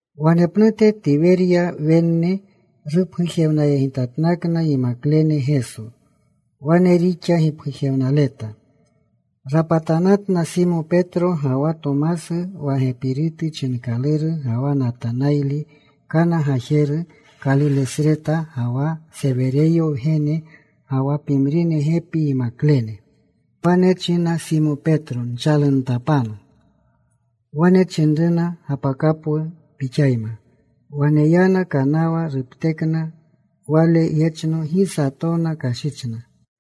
Wanepnute Tiwerya Wenne rupgujewnayegitatnakna yimaklene Geso. Wane rixa gipgujewnaleta. Rapatanatna Simo Petro, ga wa Tomasu wa Gepirutu chinkaluru, ga wa Natanayli, Kana gajeru Kalilesreta, ga wa Sewereyo wgenene, ga wa pimrine gepi yimaklene. Wane china Simo Petro, “Nchaluntapanu.” Wane chinruna, “Gapakapwu pixayma.” Wane yana. Kanawa ruptekna. Wale yechno, gi satona kashichna.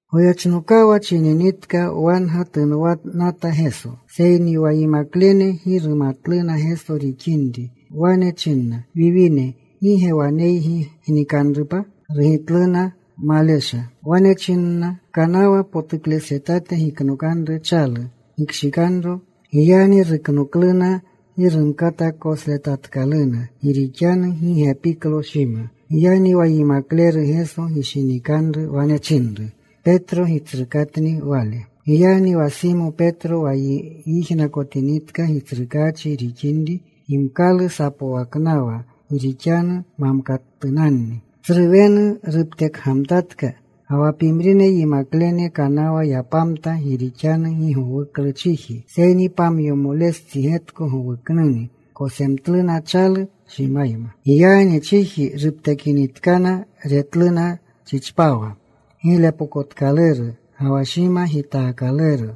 Goyechnokawa chininitka, wanga tunwanata Geso. Seyni wa yimaklene gi rumatluna Geso rixinri. Wane chinna, “Wiwine, ¿gi ge waneygi gnikanrupa?” Rugitluna, “Malesha.” Wale wane chinna, “Kanawa potuklesretate giknokanru chalu. Gikshikanro.” Giyagni ruknokluna. Gi rumkata kosletatkaluna, gi rixanu gi gepiklo shima. Giyagni wa yimakleru Geso gishinikanru wane chinru Petro, “Gitsrukaachikni Wale.” Giyagni wa Simo Petro wa yijnakotinitka Gitsrukaachi rixinri, gimkalu sapwaknawa gi rixanu mamkatunanni. Tsru wenu ruptekgamtatka. Ga wa pimrine yimaklene kanawa yapamta, gi rixanu gi gowuklu chiji, seyni pamyomolestsi getko gowuknuni. Kosemtluna chalu shimayma. Giyagni chiji ruptekinitkana, retluna chichpawa giglepokotkaluru, ga wa shima gitaakaluro,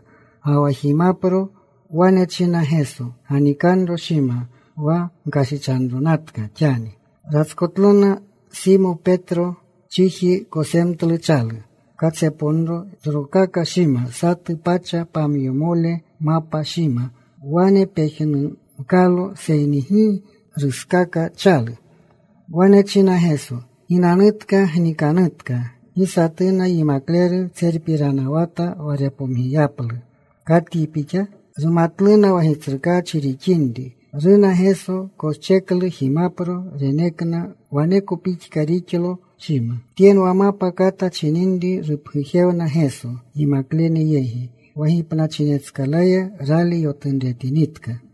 ga wa jimapro. Wane chinna Geso, “Ganikanro shima, wa gkashichanronatka xani.” Ratskotlota Simo Petro. Chiji kosemtlu chalu. Katsepomnuro tsrokaka shima. Satu pacha pamyomole mapa shima. Wane pejnumkalo, seyni gi ruskaka chalu. Wane chinna Geso, “Ginanutka. Gnikanutka.” Gi satuna yimakleru tserpiranawata wa repomgiyaplu, “¿Katyi Pixa?” Rumatluna wa Gitsrukaachi rixinri. Runa Geso. Koscheklu jimapro. Renekna. Waneko pixka rixlo shima. Tyenwa mapa kata chininri rupgujewna Geso yimaklene yegi wa gipnachinetskalaya rali yotunretinitka.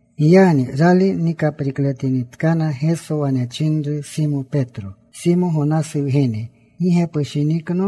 Giyagni rali nikaprikletinitkana Geso wane chinru Simo Petro, “Simo Gonasu wgene, ¿gi ge pushinikno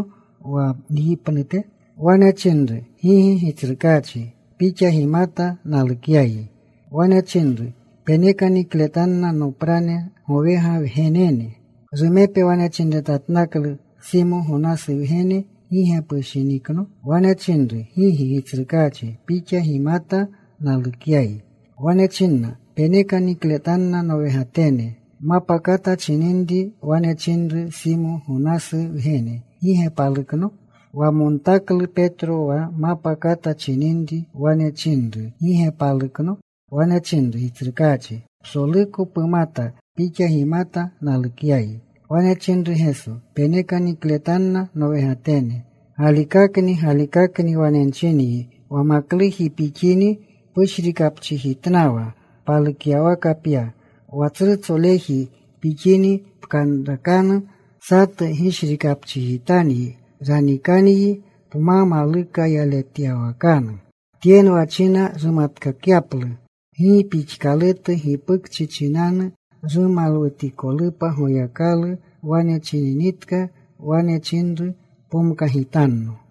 wa nyi pnute?” Wane chinru, “Gigi, Gitsrukaachi. Pixa gimata nalukyayi.” Wane chinru, “Peneka nikletanna noprane gowega wgenene.” Rumepe wane chinretatnaklu, “Simo, Gonasu wgene, ¿gi ge pushinikno?” Wane chinru, “Gigi, Gitsrukaachi. Pixa gimata nalukyayi.” Wane china, “Peneka nikletanna nowegatene.” Mapa kata chininri wane chinru, “Simo, Gonasu wgene, ¿Gi ge palukno?” Wamontaklu Petro wa mapa kata chininri wane chinru, “¿Gi ge palukno?” Wane chinru, “Gitsrukaachi, Psoluko pumata. Pixa gimata nalukyayi.” Wane chinru Geso, “Peneka nikletanna nowegatene. Galikakni, galikakni wane nchinyi wa makluji pixini pushrikapchijitnawa. Palukyawaka pya. Wa tsrutsoleji pixini pkanrakanu. Satu gishrikapchijitanyi. Ranikanyi pma maluka yaletyawakanu.” Tyenwa china rumatkakyaplu gi pixkalutu gipukchi chinanu rumalwutikolupa Goyakalu. Wane chininitka wane chinru, “Pomkagitanno.”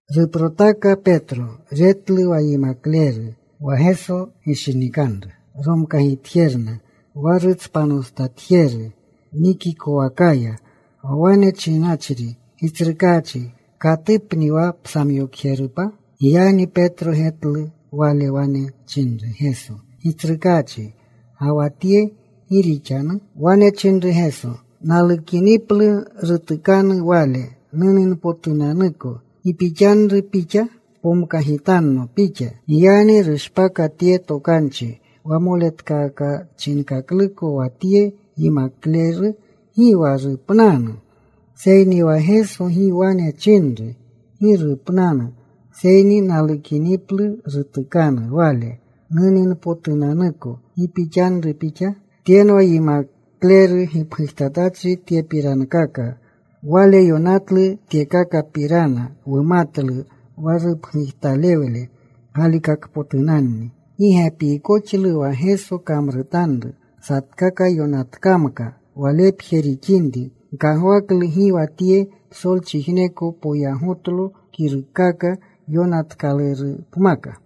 Ruprotaka Petro. Retlu wa yimakleru wa Geso gishinikanru romkagitjerna, wa rutspanostatkoxjeru nikikowakaya, wa wane chinachri, “Gitsrukaachi, ¿katupni wa psamyokjerupa?” Giyagni Petro getlu wale. Wane chinru Geso, “Gitsrukaachi, ¿ga wa tye, gi rixanu?” Wane chinru Geso, “Nalukiniplu rutukanu wale nuninpotunanuko, ¿gi pixanru pixa? Pomkagitanno pixa.” Giyagni rushpaka tye tokanchi wa moletkakachinkakluko, wa tye yimakleru gi wa rupnanu. Seyni wa Geso gi wane chinru, “Gi rupnanu,” seyni, “Nalukiniplu rutukanu wale nuninpotunanuko, ¿gi pixanru pixa?” Tyenwa yimakleru gipgujtatachri tyekakapirana. Wale yonatlu tyekakapirana. Wumatlu wa rupgujtalewle galikakpotunanni. Gi gepiikoxlu wa Geso kamrutanru. Satkaka yonatkamka walepje rixinri, nkagwaklu gi wa tye psolchijneko poyagotlo kiruukaka yonatkalurupmaka.